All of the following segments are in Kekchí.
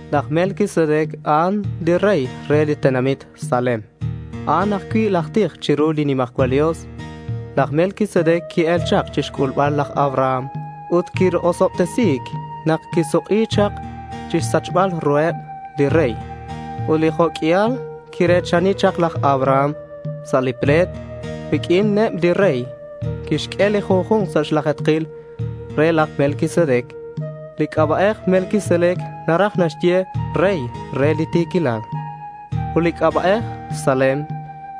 Laj Melquisedec a'an li rey re li tenamit Salem. A'an ajcui' laj tij chiru li nimajcual Dios. Laj Melquisedec qui-el chak chixc'ulbal laj Abraham ut quirosobtesi nak quisuk'i chak chixsachbal ruheb li rey. Ut li jo' q'uial quire̱chani chak laj Abraham sa' li ple̱t riq'uineb li rey, quixq'ue li junju̱nk sa' xlaje̱tkil re laj Melquisedec. Li c'aba'ej Melquisedec naraj naxye “rey re li ti̱quilal”. Ut li c'aba'ej Salem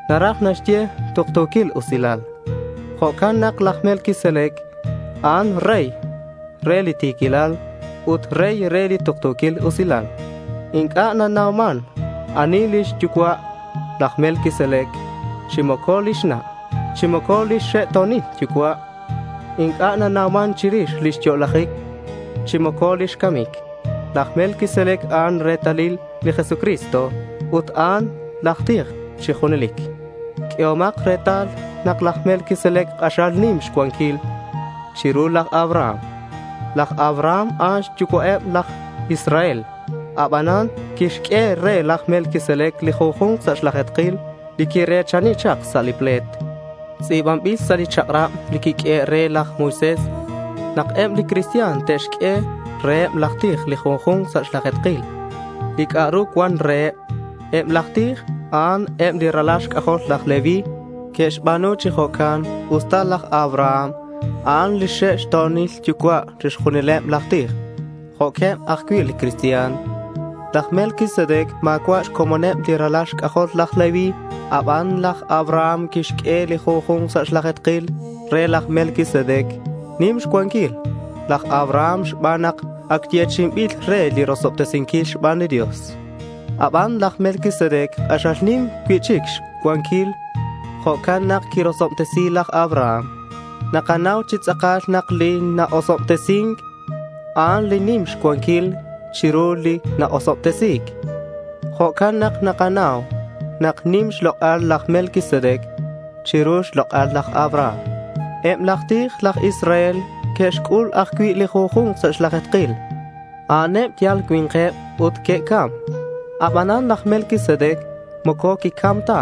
naraj naxye “tuktu̱quil usilal”. Jo'can nak laj Melquisedec, a'an rey re li ti̱quilal ut rey re li tuktu̱quil usilal. Inc'a' nanauman ani lix yucua' laj Melquisedec chi moco lix na' chi moco lix xe'to̱nil yucua'. Inc'a' nanauman chirix lix yo'lajic chi moco lix camic. Laj Melquisedec, a'an retalil li Jesucristo ut a'an laj tij chi junelic. Q'uehomak retal nak laj Melquisedec, k'axal nim xcuanquil chiru laj Abraham. Laj Abraham, a'an xyucua'eb laj Israel, abanan quixq'ue re laj Melquisedec li junju̱nk sa' xlaje̱tkil li quire̱chani chak sa' li ple̱t. Tz'i̱banbil sa' li chak'rab li quiq'uehe' re laj Moisés nak eb li cristian te'xq'ue reheb laj tij li junju̱nk sa' xlaje̱tkil li c'a'ru cuan reheb. Eb laj tij, a'an eb li ralal xc'ajol laj Leví. Que'xba̱nu chi jo'can usta laj Abraham, a'an lix xe'to̱nil yucua' chixjunileb, laj tij jo'queb ajcui' li cristian. Laj Melquisedec ma̱cua' xcomoneb li ralal xc'ajol laj Leví aban laj Abraham quixq'ue li junju̱nk sa' xlaje̱tkil re laj Melquisedec. Nim xcuanquil laj Abraham xban nak ac yechi'inbil re li rosobtesinquil xban li Dios. Aban laj Melquisedec k'axal nim cui'chic lix cuanquil. Jo'can nak quirosobtesi laj Abraham. Nakanau chi tz'akal nak li na-osobtesin, a'an li nim xcuanquil chiru li na-osobtesi̱c. Jo'can nak nakanau nak nim xlok'al laj Melquisedec chiru xlok'al laj Abraham. Eb laj tij aj Israel que'xc'ul ajcui' li junju̱nk sa' xlaje̱tkil. A'aneb yal cui̱nkeb ut que'cam. Abanan laj Melquisedec moco quicam ta.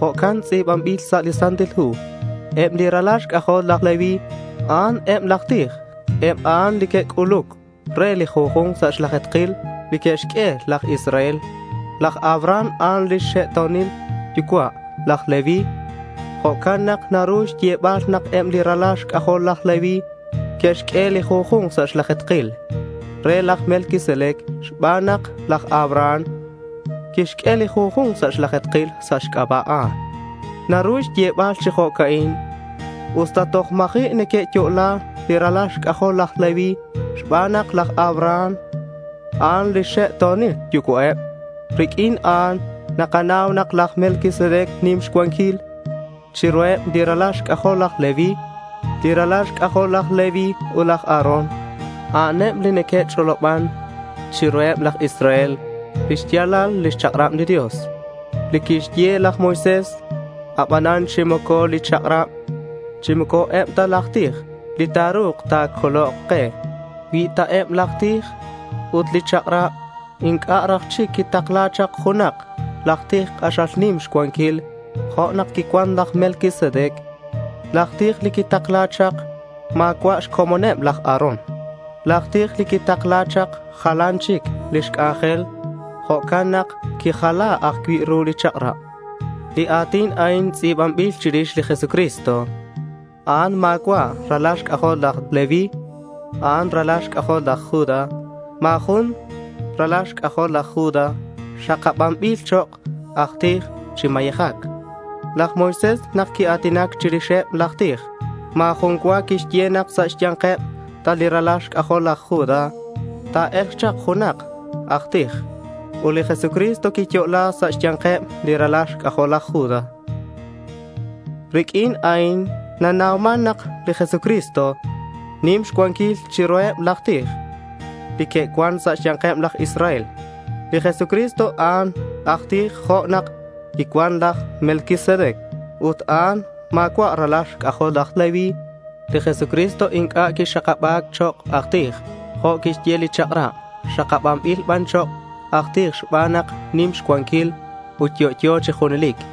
Jo'can tz'i̱banbil sa' li Santil Hu. Eb li ralal xc'ajol laj Leví, a'an eb laj tij. Eb a'an li que'c'uluc re li junju̱nk sa' xlaje̱tkil li que'xq'ue laj Israel. Laj Abraham a'an lix xe'to̱nil yucua' laj Leví. Jo'can nak naru xyebal nak eb li ralal xc'ajol laj Leví que'xq'ue li junju̱nk sa' xlaje̱tkil re laj Melquisedec xban nak laj Abraham quixq'ue li junju̱nk sa' xlaje̱tkil sa' xc'aba'eb a'an. Naru xyebal chi jo'can usta toj ma̱ji' neque'yo'la li ralal xc'ajol laj Leví xban nak laj Abraham, a'an lix xe'to̱nil yucua'eb. Riq'uin a'an nakanau nak laj Melquisedec nim xcuanquil chiruheb li ralal xc'ajol laj Leví. Li ralal xc'ajol laj Leví ut laj Aarón, a'aneb li neque'ch'oloban chiruheb laj Israel lix ya̱lal lix chak'rab li Dios li quixye laj Moisés. Abanan chi moco li chak'rab chi moco eb laj tij li ta̱ru̱k ta̱colok ke. Cui ta eb laj tij ut li chak'rab, inc'a' raj chic quitakla̱c chak junak aj tij k'axal nim xcuanquil jo' nak quicuan laj Melquisedec. Laj tij li quitakla̱c chak ma̱cua' xcomoneb laj Aarón. Laj tij li quitakla̱c chak jalan chic lix c'anjel. Jo'can nak quijala ajcui' ru li chak'rab. Li a̱tin a'in tz'i̱banbil chirix li Jesucristo. A'an ma̱cua' ralal xc'ajol laj Leví. A'an ralal xc'ajol laj Judá. Ma̱ jun ralal xc'ajol laj Judá xakabanbil chok' aj tij chi mayejac. Laj Moisés, nak quia̱tinac chirixeb laj tij, ma̱ jun cua quixye nak sa' xya̱nkeb ta li ralal xc'ajol laj Judá ta̱e̱lk chak junak aj tij. Ut li Jesucristo quiyo'la sa' xya̱nkeb li ralal xc'ajol laj Judá. Riq'uin a'in nanauman nak li Jesucristo nim xcuanquil chiruheb laj tij li que'cuan sa' xya̱nkeb aj Israel. Li Jesucristo, a'an aj tij jo' nak quicuan laj Melquisedec ut a'an ma̱cua' ralal xc'ajol laj Leví. Li Jesucristo inc'a' quixakaba̱c chok' aj tij jo' quixye li chak'rab. Xakabanbil ban chok' aj tij xban nak nim xcuanquil ut yo'yo chi junelic.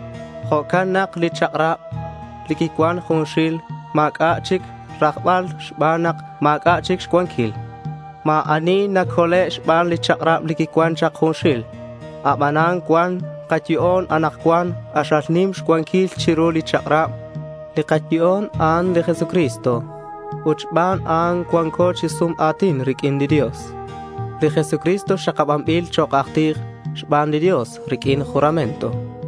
Jo'can nak li chak'rab li quicuan junxil ma̱c'a' chic rajbal xban nak ma̱c'a' chic xcuanquil. Ma̱ ani nacole' xban li chak'rab li quicuan chak junxil. Abanan cuan kayo'on anakcuan k'axal nim xcuanquil chiru li chak'rab. Li kayo'on, a'an li Jesucristo. Ut xban a'an cua̱nko chi sum a̱tin riq'uin li Dios. Li Jesucristo xakabanbil chok' aj tij xban li Dios riq'uin juramento.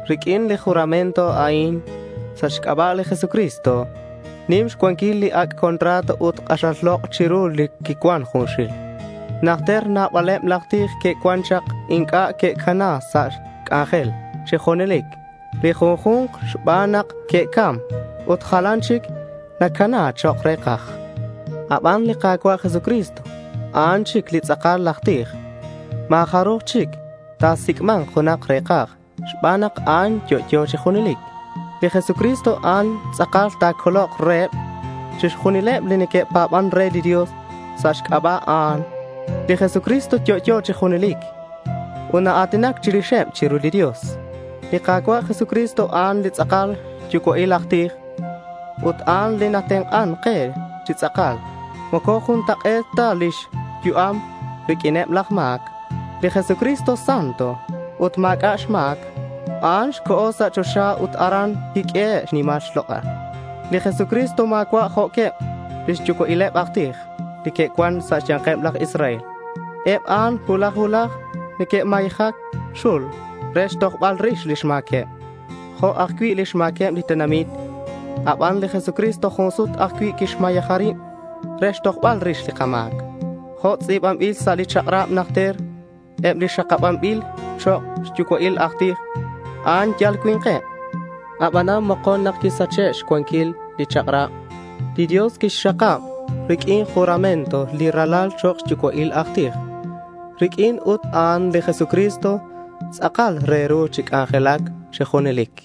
Riq'uin li juramento a'in, sa' xc'aba' li Jesucristo, nim xcuanquil li ac' contrato, ut k'axal lok' chiru li quicuan junxil. Najter nabaleb laj tij que'cuan chak. Inc'a' que'cana sa' xc'anjel chi junelic li junju̱nk xban nak neque'cam ut jalan chic nacana chok' re̱kaj. Aban li Ka̱cua' Jesucristo a'an chic li tz'akal laj tij. Ma̱ jaruj chic ta̱sic'ma̱nk junak re̱kaj xban nak a'an yo'yo chi junelic. Li Jesucristo a'an tz'akal ta̱colok reheb chixjunileb li neque'pa̱ban re li Dios sa' xc'aba' a'an. Li Jesucristo yo'yo chi junelic ut naa̱tinac chirixeb chiru li Dios. Li Ka̱cua' Jesucristo, a'an li tz'akal xyucua'il aj tij. Ut a'an li natenk'an ke chi tz'akal. Moco juntak'e̱t ta lix yu'am riq'uineb laj ma̱c. Li Jesucristo santo ut ma̱c'a' xma̱c. A'an co̱ sa' choxa ut aran quiq'uehe' xnimal xlok'al. Li Jesucristo ma̱cua' jo'queb lix yucua'ileb aj tij li que'cuan sa' xya̱nkeb laj Israel. Eb a'an cuulaj cuulaj neque'xmayeja li xul re xtojbal rix lix ma̱queb jo' ajcui' lix ma̱queb li tenamit. Aban li Jesucristo jun sut ajcui' quixmayeja rib re xtojbal rix li kama̱c. Jo' tz'i̱banbil sa' li chak'rab najter, eb li xakabanbil chok' xyucua'il aj tij, a'an yal cui̱nkeb. Abanan mokon, nak quisache' xcuanquil li chak'rab, li Dios quixxakab riq'uin juramento li Ralal chok' xyucua'il aj tij. Riq'uin ut a'an li Jesucristo tz'akal re ru chi c'anjelac chi junelic.